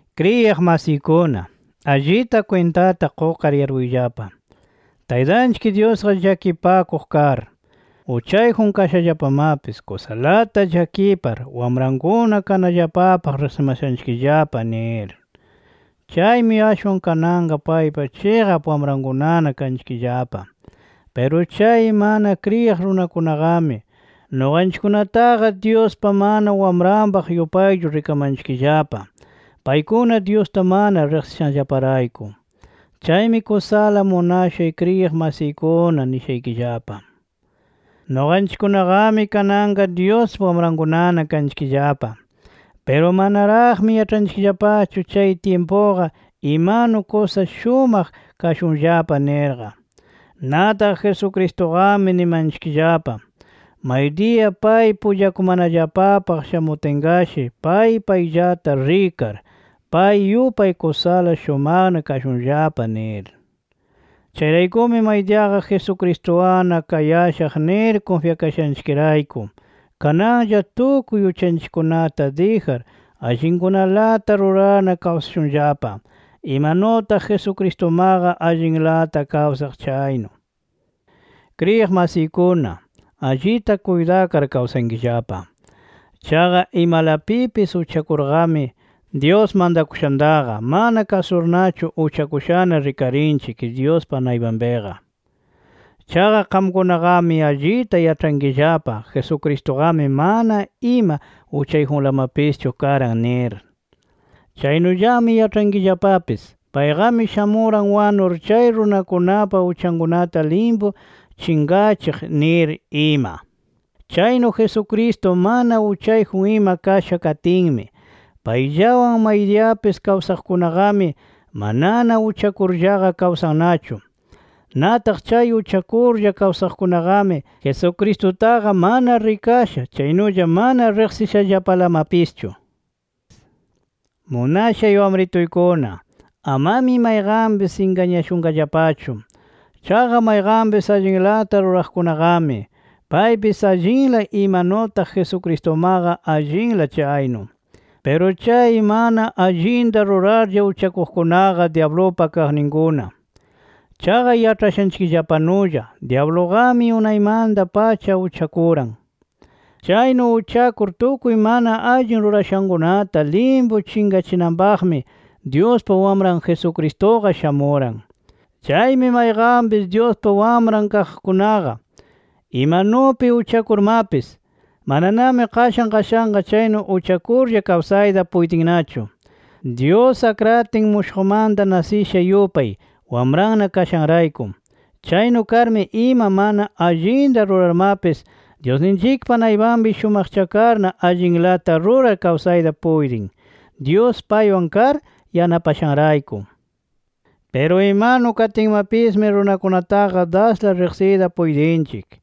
Kriyiq masiykuna, allita kwintata qukar yarpuyllapa: Taytanchik Dyusqa llakipakuq kar, uchayjun kashallapamapis kusalata llakipar wamrankuna kanallapapaq riqsimashanchikllapa nir. Chaymi ashwan kananqa paypa chiqap wamrankunana kanchikllapa. Piru chay mana kriyiq runakunaqami, nuqanchikkunataqa Dyuspa mana wamranpaq yupaychu rikamanchikllapa paykuna Dyusta mana riqsishanllaparayku. Chaymi kusala munashay kriyiq masiykuna nishaykillapa: Nuqanchikkunaqami kananqa Dyuspa wamrankunana kanchikllapa. Piru manaraqmi yaĉhanchikllapachu chay tyimpuqa imanu kusa shumaq kashunllapa nirqa. Nataq Jesucristuqami nimanchikllapa, maydiya pay pullakumanallapapaq shamutinqashi pay payllata rikar, pay yupay kusala shumaqna kashunllapa nir. Chayraykumi maydiyaqa Jesucristuwanna kayashaq nir kunfyakashanchikrayku, kananlla tukuy uchanchikkunata dijar, allinkunalata rurarna kawsashunllapa, imanutaq Jesucristumaqa allinlata kawsaq chaynu. Kriyiq masiykuna, allita kuytakar kawsankillapa. Chaqa imalapipis uchakurqami, Dyus mantakushantaqa mana kasurnachu uchakushana rikarinchik Dyuspa naypanpiqa. Chaqa qamkunaqami allita yaĉhankillapa Jesucristuqami mana ima uchayjunlamapischu karan nir. Chaynullami yaĉhayankillapapis payqami shamuran wanur chay runakunapa uchankunata limpu chinqachiq nir ima. Chaynu Jesucristo mana uchayjun ima kasha katinmi, payllawan maydiyapis kawsaqkunaqami, manana uchakurllaqa kawsannachu. Nataq chay uchakurlla kawsaqkunaqami, Jesucristutaqa mana rikasha, chaynulla mana riqsishallapalamapischu. Munashay wamrituykuna, amami mayqanpis ingañashunqallapachu. Chaqa mayqanpis allinlata ruraqkunaqami, paypis allinla imanutaq Jesucristumaqa allinla chaynu. Piru chay mana allinta rurarlla uchakuqkunaqa dyablupa kaqninkuna. Chaqa yaĉhashaykillapanulla dyabluqami unaymanta-pacha uchakuran. Chaynu uchakur tukuy mana allin rurashankunata limpu chinqachinanpaqmi, Dyuspa Wamran Jesucristuqa shamuran. Chaymi mayqanpis Dyuspa wamran kaqkunaqa, imanupi uchakurmapis mananami qashan qashanqa chaynu uchakurlla kawsayta puytinnachu, Dyus akratin mushuqmanta nasisha yupay, wamranna kashanrayku. Chaynu karmi, ima mana allinta rurarmapis Dyusninchikpa naypanpi shumaqchakarna allinlata rurar kawsayta puytin, Dyus paywan kar yanapashanrayku. Piru imanu katinmapismi runakunataqa dasla riqsiyta puytinchik,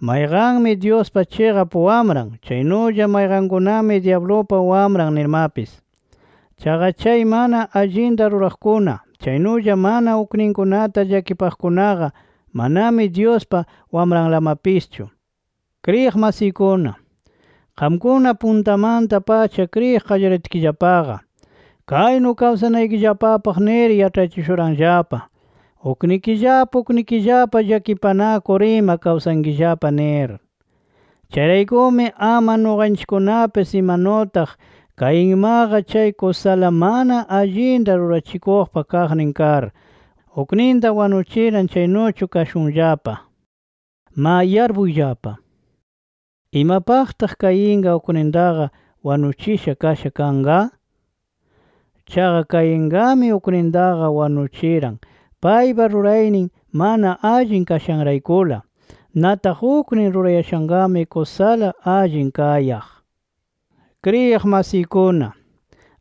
mayqanmi Dyuspa chiqap wamran, chaynulla mayqankunami dyablupa wamran nirmapis. Chaqa chay mana allinta ruraqkuna, chaynulla mana ukninkunata llakipaqkunaqa, manami Dyuspa wamranlamapischu. Kriyiq masiykuna, qamkuna puntamanta-pacha kriyiq qallaritkillapaqa, kaynu kawsanaykillapapaq nir yaĉhachishuranllapa: Uknikillapa uknikillapa llakipanakur ima kawsankillapa nir. Chayraykumi ama nuqanchikkunapis imanutaq Cainmaqa chay kusala mana allinta rurachikuqpa kaqnin kar, ukninta wanuchiran chaynuchu kashunllapa. ¡Ma yarpuyllapa! ¿Imapaqtaq Cainqa uknintaqa wanuchisha kasha kanqa? Chaqa Cainqami uknintaqa wanuchiran, paypa ruraynin mana allin kashanraykula. Nataq uknin rurayashanqami kusala allin kayaq. Kriyiq masiykuna,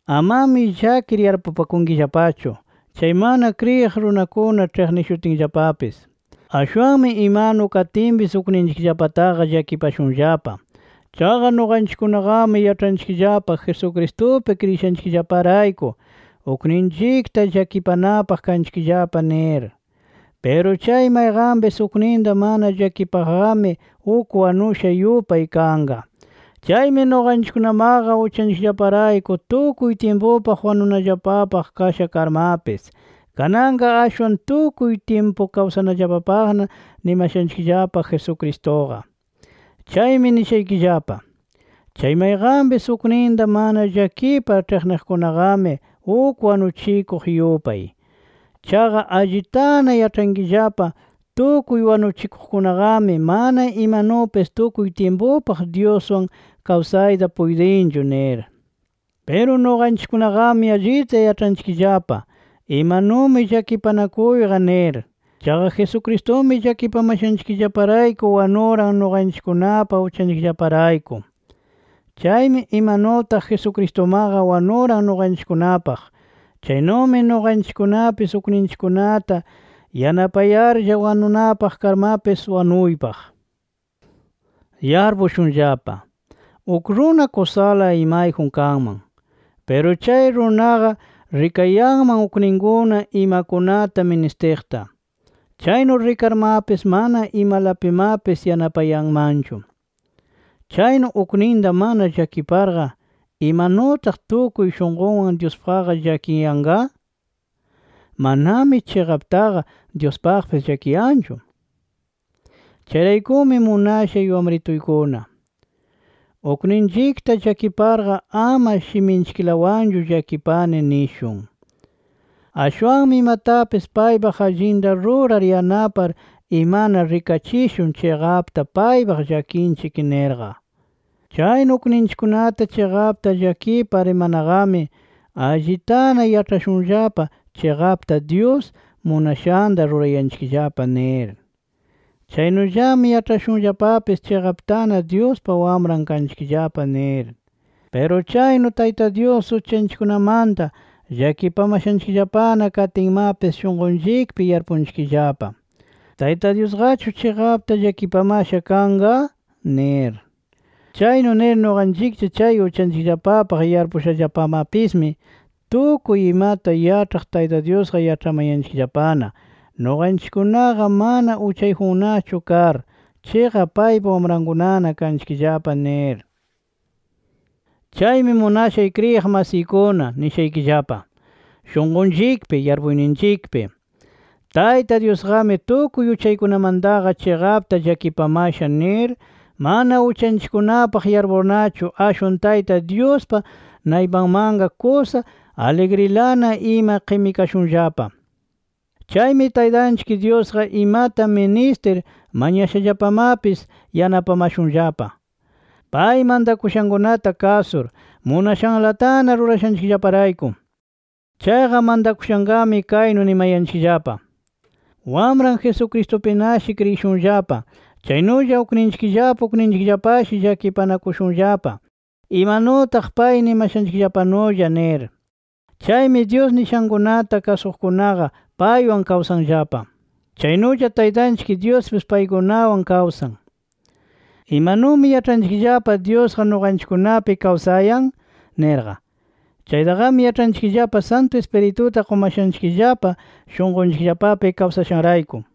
amami llakir yarpupakunkillapachu, chay mana kriyiq runakuna ĉhiqnishutinllapapis. Ashwanmi imanu katinpis ukninchikllapataqa llakipashunllapa. Chaqa nuqanchikkunaqami yaĉhanchikllapa Jesucristupi kriyishanchikllaparayku, ukninchikta llakipanapaq kanchikllapa nir. Piru chay mayqanpis ukninta mana llakipaqqami uk wanusha yupay kanqa. Chaymi nuqanchikkunamaqa uchanchikllaparayku tukuy tyimpupaq wanunallapapaq kasha karmapis, kananqa ashwan tukuy tyimpu kawsanallapapaqna nimashanchikllapa Jesucristuqa. Chaymi nishaykillapa: Chay mayqanpis ukninta mana llakipar ĉhiqniqkunaqami uk wanuchikuq yupay. Chaqa allitana yaĉhankillapa tukuy wanuchikuqkunaqami mana imanupis tukuy tyimpupaq Dyuswan kawsayta puytinchu nir. Piru nuqanchikkunaqami allita yaĉhanchikllapa imanumi llakipanakuyqa nir. Chaqa Jesucristumi llakipamashanchikllaparayku wanuran nuqanchikkunapa uchanchikllaparayku. Chaymi imanutaq Jesucristumaqa wanuran nuqanchikkunapaq, chaynumi nuqanchikkunapis ukninchikkunata yanapayarlla wanunapaq karmapis wanuypaq. Yarpushunllapa: Uk runa kusala imayjun kanman. Piru chay runaqa rikayanman ukninkuna imakunata ministiqta. Chaynu rikarmapis mana imalapimapis yanapayanmanchu. Chaynu ukninta mana llakiparqa ¿imanutaq tukuy shunqunwan Dyuspaqqa llakiyanqa? Manami chiqaptaqa Dyuspaqpis llakiyanqachu. Chayraykumi munashay wamrituykuna, ukninchikta llakiparqa ama shiminchiklawanchu llakipani nishun. Ashwanmi imatapis paypaq allinta rurar yanapar imana rikachikushun chiqapta paypaq llakinchik nirqa. Chaynu ukninchikkunata chiqapta llakipar imanaqami allitana yaĉhashunllapa chiqapta Dyus munashanta rurayanchikllapa nir. Chaynullami yaĉhashunllapapis chiqaptana Dyuspa wamran kanchikllapa nir. Piru chaynu Tayta Dyus uchanchikkunamanta llakipamashanchikllapana katinmapis shunqunchikpi yarpunchikllapa, ¿Tayta Dyusqachu chiqapta llakipamasha kanqa? nir. Chaynu nir nuqanchiklla chay uchanchikllapapaq yarpushallapamapismi, tukuy imata yaĉhaq Tayta Dyusqa yaĉhamayanchikllapana nuqanchikkunaqa mana uchayjunnachu kar, chiqap paypa wamrankunana kanchikllapa nir. Chaymi munashay kriyiq masiykuna nishaykillapa: Shunqunchikpi, yarpuyninchikpi Tayta Dyusqami tukuy uchaykunamantaqa chiqapta llakipamasha nir, mana uchanchikkunapaq yarpurnachu ashwan Tayta Dyuspa naypanmanqa kusa aligrilana ima qimikashunllapa. Chaymi Taytanchik Dyusqa imata ministir mañashallapamapis yanapamashunllapa, pay mantakushankunata kasur, munashanlatana rurashanchikllaparayku. Chaqa mantakushanqami kaynu nimayanchikllapa: “Wamran Jesucristupinashi kriyishunllapa, chaynulla ukninchikllapa ukninchikllapashi llakipanakushunllapa, imanutaq pay nimashanchikllapanulla” nir. Chaymi Dyus nishankunata kasuqkunaqa paywan kawsanllapa, chaynulla Taytanchik Dyuspis paykunawan kawsan. ¿Imanumi yaĉhanchikllapa Dyusqa nuqanchikkunapi kawsayan? nirqa. Chaytaqami yaĉhanchikllapa, Santu Ispirituta qumashanchikllapa shunqunchikllapapi kawsashanrayku.